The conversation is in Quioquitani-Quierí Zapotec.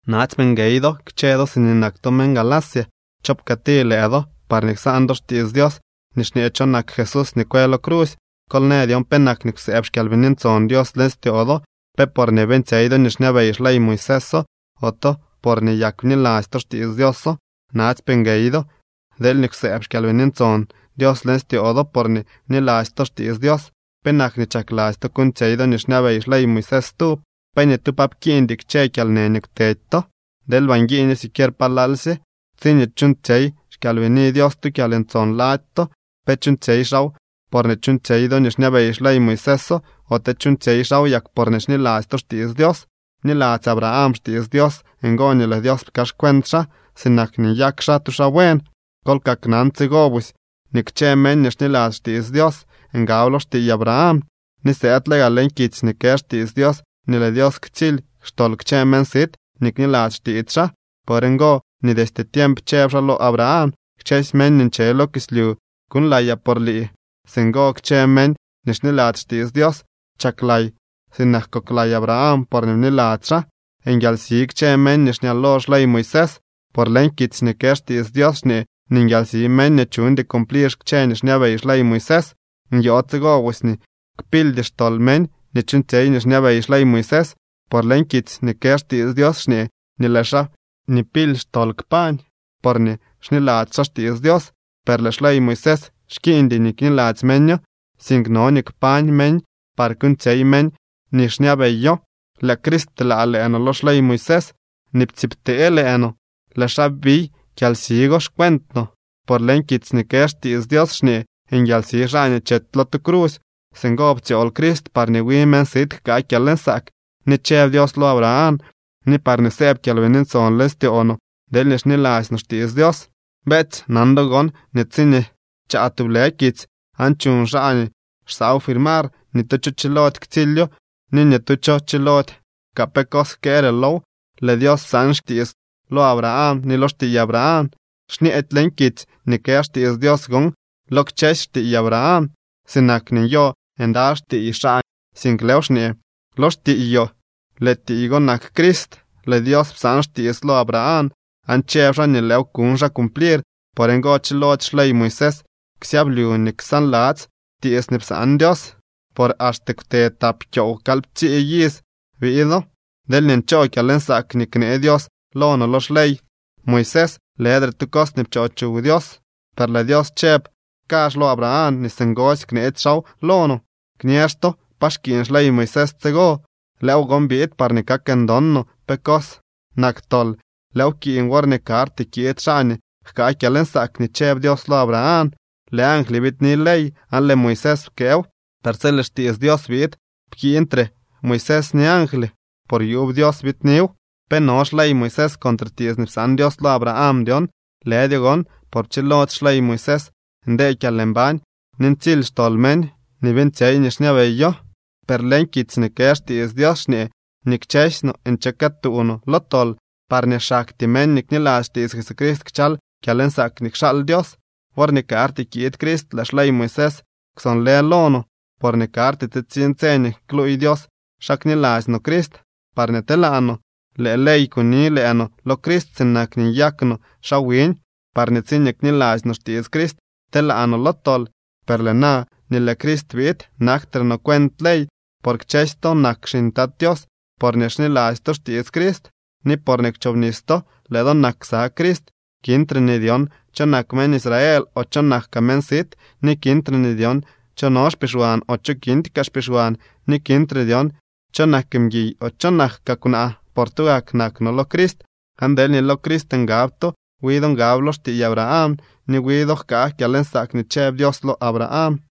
¡Natsypee nguey kchë do siñee nak to meñ Galacia! ¿Cho pkëëti lëë do, parñee ksaan do xtiits Dios nii xñee cho nak Jesús nii kwë lo crusy? Kol në dyon penak nii kwsëëb xKyalbini Ntson Dios leñ styoo do. ¿Pe porñee beeñtsyey do nii xñabey xley Moiséso, ote porñee yak bniladzy to xtiits Dioso? Natsypee nguey do. Deelñee kwsëëb xKyalbini Ntson Dios leñ styoo do porñee bniladzy to xtiits Dios, ¿penak nii chakladzy to kuuñtsyey do nii xñabey xley Moisés stub? ¿Pe ni tu pa pkiiñdy kchë kyalnë nii kwtedy to? ¡Deelba nguiiño siquier palalsye! Tsiñee chuuñtsyey xKyalbini Dios tu kyalntson lady to, ¿pe chuuñtsyey xaaw porñee chuuñtsyey do nii xñabey xley Moisés, ote chuuñtsyey xaaw yak porñee xniladzy to xtiits Dios? Bniladzy Abraham xtiits Dios, ngo nii lëë Dios pkaaxcuent xaa sinak nii nyak xaa tu xaa buen. Kol kaknan tsigo busy nii kchë meñ nii xniladzy xtiits Dios ngab lo xtiiy Abraham. Ni sëëdle gaa leñ kitsy nii kë xtiits Dios nii lëë Dios ktsily xtol kchë meñ sit nii kniladzy xtiits xaa. Por ngo nii destye tiemp chëb xaa lo Abraham: “Kchësy meñ nii nche lo kislyu kuuñlayaa por lii.” Singo kchë meñ nii xniladzy xtiits Dios chaklay sinak koklay Abraham, porñee bniladzy xaa. Nguialsi kchë meñ nii xñalo xley Moisés. Por leñ kitsy nii kë xtiits Dios xñee nii nguialsi meñ nii chuñdy cumplir kchë nii xñabey xley Moisés. Nyoo tsigo busy nii kpildy xtol meñ nii chuuñtsyey nii xñabey xley Moisés, por leñ kitsy nii kë xtiits Dios xñee nii lëë xaa nii pily xtol kpañ, porñee xniladzy xaa xtiits Dios. Per lëë xley Moisés xkiiñdy nii kniladzy meño, sink no nii kpañ meñ par kuuñtsyey meñ nii xñabeyo. Lëë Crist pteelaa lëë no lo xley Moisés nii ptsiibtee lëë no. Lëë xaa biy kyalsi go xcuent no, por leñ kitsy nii kë xtiits Dios xñee: “Nguialsi xaa nii chety lo tu crusy.” Singo ptsyool Crist parñee wi meñ sit jkaa kyalnsaak nii chëb Dios lo Abraham ni parñee sëëb Kyalbini Ntson leñ styoo no deelñee xniladzy no xtiits Dios. Beetsy, nan do gon nii tsiñee chaa tublë kitsy, aan chuñ xaa nii xsaaw firmar, ni tu cho chilody ktsilyo ni ni tu cho chilody kaa pe cos jkëëre low. Lëë Dios psaan xtiits lo Abraham ni lo xtiiy Abraham. Xñeedy leñ kitsy nii kë xtiits Dios gon: “lo kchësy xtiiy Abraham”, sinak nii nyo ndaly xtiiy xaa, sink lëëw xñee: “lo xtiiyoo.” Lëë tiiy go nak Crist. Lëë Dios psaan xtiits lo Abraham aan chëb xaa nii lëëw kuñ xaa cumplir. Por ngo chilody xley Moisés ksyablyu ni ksaanladzy tiits nii psaan Dios, por axte kwte tap kyoow kalyptsii iz biido. Deelñee nchoo kyalnsaak nii knee Dios lo no lo xley Moisés, lëdre tu cos nii pchoo chuw Dios. Per lëë Dios chëb kazh lo Abraham nii singosy kneetsy xaaw lo no. Kñëëx to, ¿pa xkiiñ xley Moisés tsigo? Lëëw gon biid parñee kak ndon no pe cos nak tol. Lëëw pkiiñ worñee karty kiid xaa nii jkaa kyalnsaak nii chëb Dios lo Abraham. Lëë angly biidni ley, aan lëë Moisés pkëëw. Per tsi lëë xtiits Dios biid, pkiiñtre Moisés ni angly, por yuub Dios biidniw. ¿Pe no xley Moisés contre tiits nii psaan Dios lo Abraham dyon? Lëdyo gon, por pchilody xley Moisés ndee kyalmbañ ni ntsily xtol meñ nii beeñtsyey nii xñabeyo. Per leñ kitsy nii kë xtiits Dios xñee nii kchësy no nche këtuu lo tol, parñee xaktyee meñ nii kniladzy xtiits Jesucrist kchal kyalnsaak nii kxaal Dios. Worñee karty kiid Crist lëë xley Moisés kwsonlë lo no, porñee karty tsitsiñ tse nii kluuy Dios xa kniladzy no Crist parñee telaa no. Lëë ley kuni lëë no lo Crist sinak nii nyak no xaa wiñ, parñee tsiñee kniladzy no xtiits Crist, telaa no lo tol. Per lëë na nii lëë Crist biid, naktre no cuent ley. Por kchësy to nak xiñ Tat Tios porñee xniladzy to xtiits Crist, ni porñee kwchobnis to, lëë do nak ksa Crist. Kintre nii dyon cho nak meñ Israel o cho nak kaa meñ sit, ni kintre nii dyon cho no xpixwan o cho kindy kaa xpixwan, ni kintre nii dyon cho nak mguiy o cho nak kaa kwnaa, por tugak nak no lo Crist. Aan deelñee lo Crist ngab to, wi do ngab lo xtiiy Abraham ni wi do jkaa kyalnsaak nii chëb Dios lo Abraham.